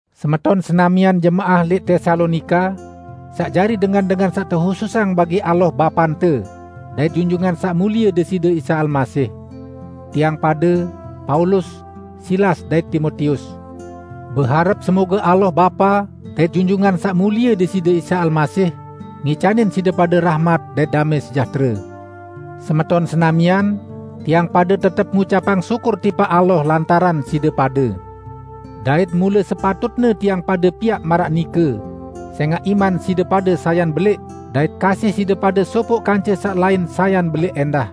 Semeton senamian jemaah lẽq Tesalonika, saq jari dengan-dengan saq tehususang bagi Allah Bapante dait Junjungan Saq Mulie Deside Isa Almasih! Tiang pade, Paulus, Silas dait Timotius beharep semoge Allah Bapa dait Junjungan Saq Mulie Deside Isa Almasih ngicanin side pade rahmat dait damẽ sejahtere. Semeton senamian, tiang pade tetep ngucapang syukur tipaq Allah lantaran side pade. Dait mule sepatutne tiang pade piaq maraq nike, sẽngaq iman side pade sayan belẽq dait kasih side pade sopoq kance saq lain sayan belẽq ẽndah.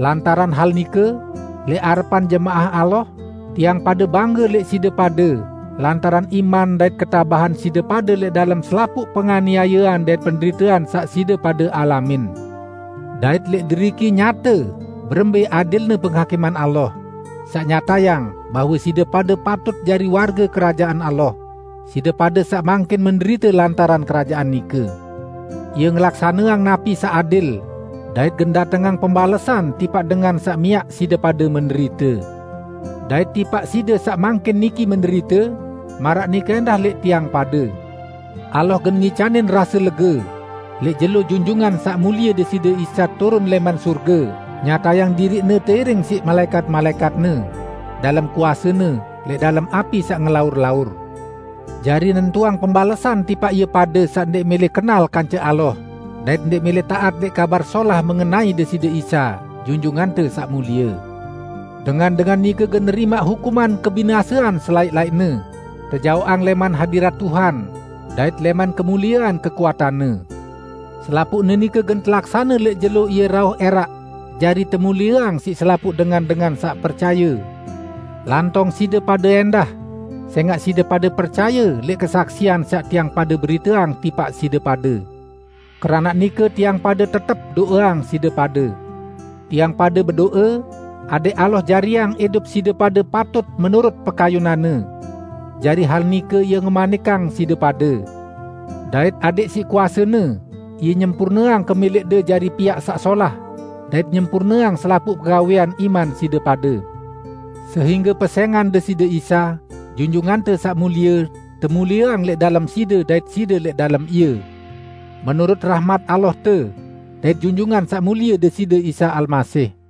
Lantaran hal nike, lẽq arepan jemaah Allah, tiang pade bangge lẽq side pade lantaran iman dait ketabahan side pade lẽq dalem selapuq penganiayean dait penderitean saq side pade alamin. Dait lẽq deriki nyate berembẽ adilne penghakiman Allah, saq nyatayang bahwe side pade patut jari warge Kerajaan Allah, side pade saq mangkin menderite lantaran Kerajaan nike. Ie ngelaksaneang napi saq adil, dait gen datengang pembalesan tipaq dengan saq miaq side pade menderite. Dait tipaq side saq mangkin niki menderite -- maraq nike ẽndah lẽq tiang pade -- Allah gen ngicanin rase lege lẽq jelo Junjungan Saq Mulie Deside Isa turun lẽman sorge nyatayang diriq-Ne teiring siq malaẽkat-malaẽkat-Ne, dalem kuase-Ne, lẽq dalem api saq ngelaur-laur, jari nentuang pembalesan tipaq ie pade saq ndẽq mẽlẽ kenal kance Allah dait ndẽq mẽlẽ taat lẽq Kabar Solah mengenai Deside Isa, Junjungante Saq Mulie. Dengan-dengan nike gen nerimaq hukuman kebinasean selaẽq-laẽqne, tejaoqang lẽman hadirat Tuhan dait lẽman kemuliean kekuatan-Ne; selapuqne nike gen telaksane lẽq jelo Ie rauh ẽraq jari temulieang siq selapuq dengan-dengan saq percaye, lantong side pade ẽndah sẽngaq side pade percaye lẽq kesaksian saq tiang pade beriteang tipaq side pade. Keranaq nike tiang pade tetep do'eang side pade. Tiang pade bedo'e adẽq Allah jariang idup side pade patut menurut pekayunan-Ne; jari hal nike Ie ngemanikang side pade. Dait adẽq siq kuase-Ne Ie nyempurneang kemẽlẽqde jari piaq saq solah, dait nyempurneang selapuq pegawẽan iman side pade. Sehingge pesẽngan Deside Isa, Junjungante Saq Mulie, temulieang lẽq dalem side dait side lẽq dalem Ie, menurut rahmat Allahte dait Junjungan Saq Mulie Deside Isa Almasih.